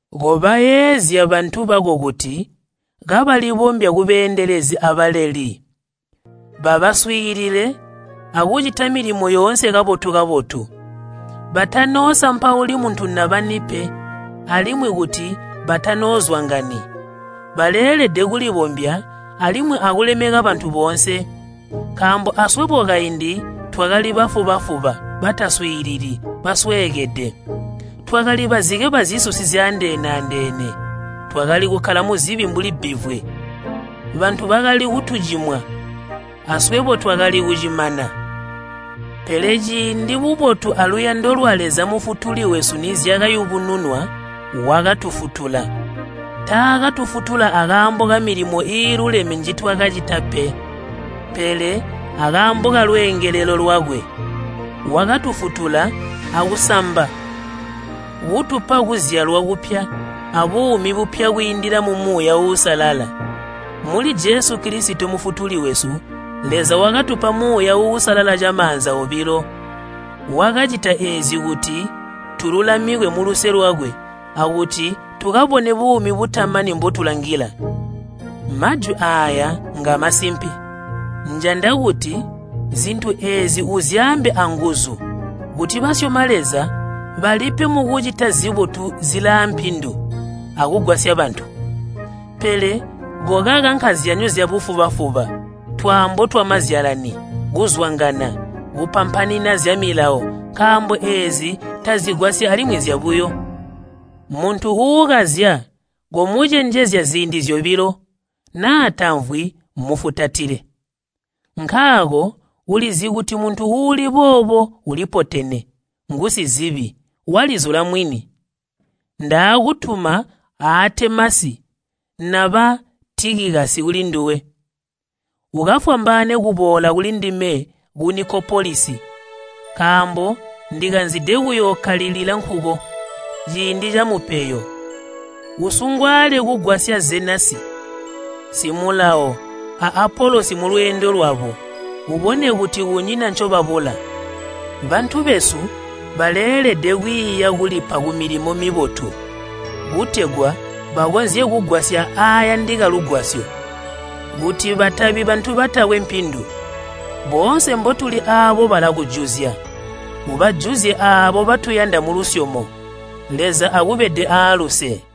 Kobayeezya bantu bako kuti kabalibombya kubeendelezi abaleli. Babaswiilile akucita milimo yoonse kabotu-kabotu. Batanoosampauli muntu naba ni pe, alimwi kuti batanoozwangani. Baleelede kulibombya alimwi akulemeka bantu boonse. Nkaambo aswebo kaindi twakali bafuba-fuba, bataswiilili, basweekede. Twakali bazike bazisusi zyaandeene-andeene. Twakali kukkala muzibi mbuli bbivwe. Bantu bakali kutucimwa aswebo twakali kucimana. Pele ciindi bubotu aluyando lwa Leza Mufutuli wesu nizyakayubununwa, wakatufutula. Taakatufutula akaambo kamilimo iiluleme njitwakacita pe, pele akaambo kalweengelelo lwakwe. Wakatufutula akusamba kutupa kuzyalwa kupya abuumi bupya kwiindila mu Muuya Uusalala. Muli Jesu Kilisito Mufutuli wesu, Leza wakatupa Muuya Uusalala camaanza obilo. Wakacita eezi kuti tululamikwe muluse lwakwe akuti tukabone buumi butamani mbotulangila. Majwi aaya ngamasimpe. Njanda kuti zintu eezi uzyaambe anguzu kuti basyoma Leza balipe mukucita zibotu zilaampindu akugwasya bantu. Pele kokaka nkazyanyo zyabufuba-fuba, twaambo twamazyalani, kuzwangana, kupampanina zyamilawo nkaambo eezi tazigwasyi alimwi nzyabuyo. Muntu uukazya, komucenjezya ziindi zyobilo, naa tamvwi, mufutatile. Nkaako ulizi kuti muntu uuli boobo ulipotene, ngusizibi, walizula mwini. Ndaakutuma Aatemasi naba Tikikasi kulinduwe, ukafwambaane kuboola kulindime ku Nikopolisi, nkaambo ndikanzide kuyookkalila nkuko ciindi camupeyo. Usungwaale kugwasya Zenasi simulawo a Apolosi mulweendo lwabo, ubone kuti kunyina ncobabula. Bantu besu baleelede kwiiya kulipa kumilimo mibotu, kutegwa bakonzye kugwasya aayandika lugwasyo, kuti batabi bantu batakwe mpindu. Boonse mbotuli aabo balakujuzya. Ubajuzye aabo batuyanda mulusyomo. Leza akubede aaluse.